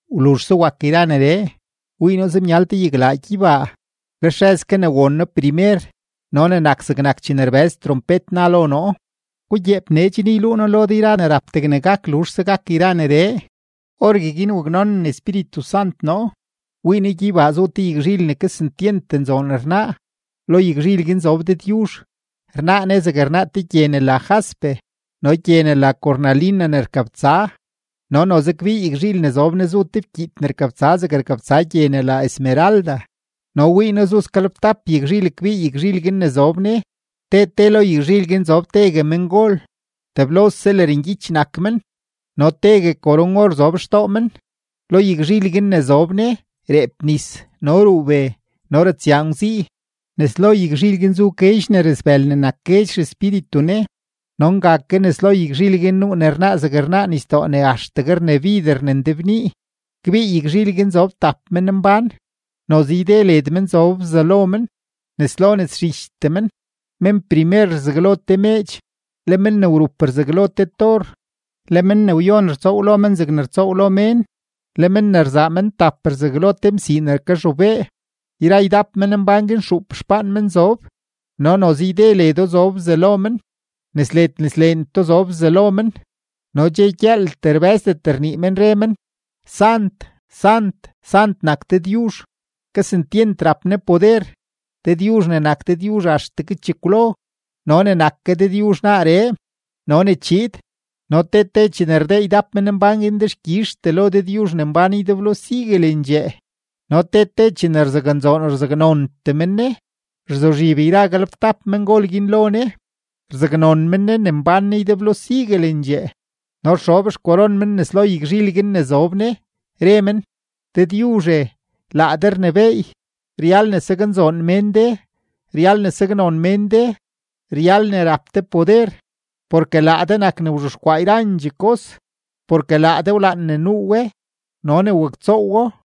Wluzhse wak yra neree, wii noo zemyal te yaglaa gyeybaa. Lex rëz ke ne won noo primer no ne nak zegnak chene rbëz trompet na lo noo: ―Gugyeep nee chen yluu noo lo de yra ne rap degne gak luzhse gak yra neree. Orgueguin waknonen Espíritu Sant noo, wii noo gyeybaa zu te yagzhil ne kesentyent nzoon rnaa, lo yagzhil guin zob Dëdyuzh. Rnaa Ne zegne rnaa te gye ne la jaspe no gye ne la cornalina ne rkabtsa. No noze kbii yagzhil ne zob Ne zu te fkyiit ne rkabtsa zegne rkabtsa gye ne la esmeralda. No wii noo zu sgalebtap yagzhil kbii yagzhil guin ne zob Ne; te te lo yagzhil guin zob tegue mengol; teblose lërngyich nak men no tegue koron-or zob xtoo men. Lo yagzhil guin ne zob Ne, reep nis, no ruu be, no ratsyaa ngwzii; nes lo yagzhil guin zu guedx ne rasbël ne nak guedx xespíritu Ne. No nga ke nes lo yagzhil guin nuu ne rnaa zeg rnaa nisdoo ne axtegue rnabider ne ndebnii. Kbii yagzhil guin zob tap menmbán, noze yde led men zob bzalo men, nes lo nes zhichtee men. Men primer rzaglo te meedx; le men ne wrup rzaglo te tor; le men ne wyon rtsoow lo men zegne rtsoow lo mén; le men ne rzaa men tap rzaglo te msii ne kazhobee. Yra ydap menmbán guin xuup xpaan men zob, no noze yde ledo zob bzalo men, nes led nes leentoo zob bzalo men; no dxe gyëëltee rbë́zdet rnii men, re men: Sant, sant, sant nak Dëdyuzh; kesentyent rap Ne poder, Dëdyuzh ne nak Dëdyuzh axtegue chekwlo no ne nak ke Dëdyuzh naaree no ne chiid. No te te chene rdee ydap menmbán guin dexkyizhtee lo Dëdyuzh ne mbán ydeblo siguelendxee no te te chene rzaknzoon rzaknontee men Ne, rzuzhib yra galebtap mengol guin lo Ne, rzaknon men Ne ne mbán Ne ydeblo siguelendxee no rxob xkoron men nes lo yagzhil guin ne zob Ne, re men: Dëdyuzhe, laa de rnebééy, ryal ne saknzoon mén de, ryal ne saknon mén de, ryal ne rap de poder, porke laa de nak ne wzhexkwaa yrandxee kos, porke laa de wlaan ne nuu we no ne waktsoowo.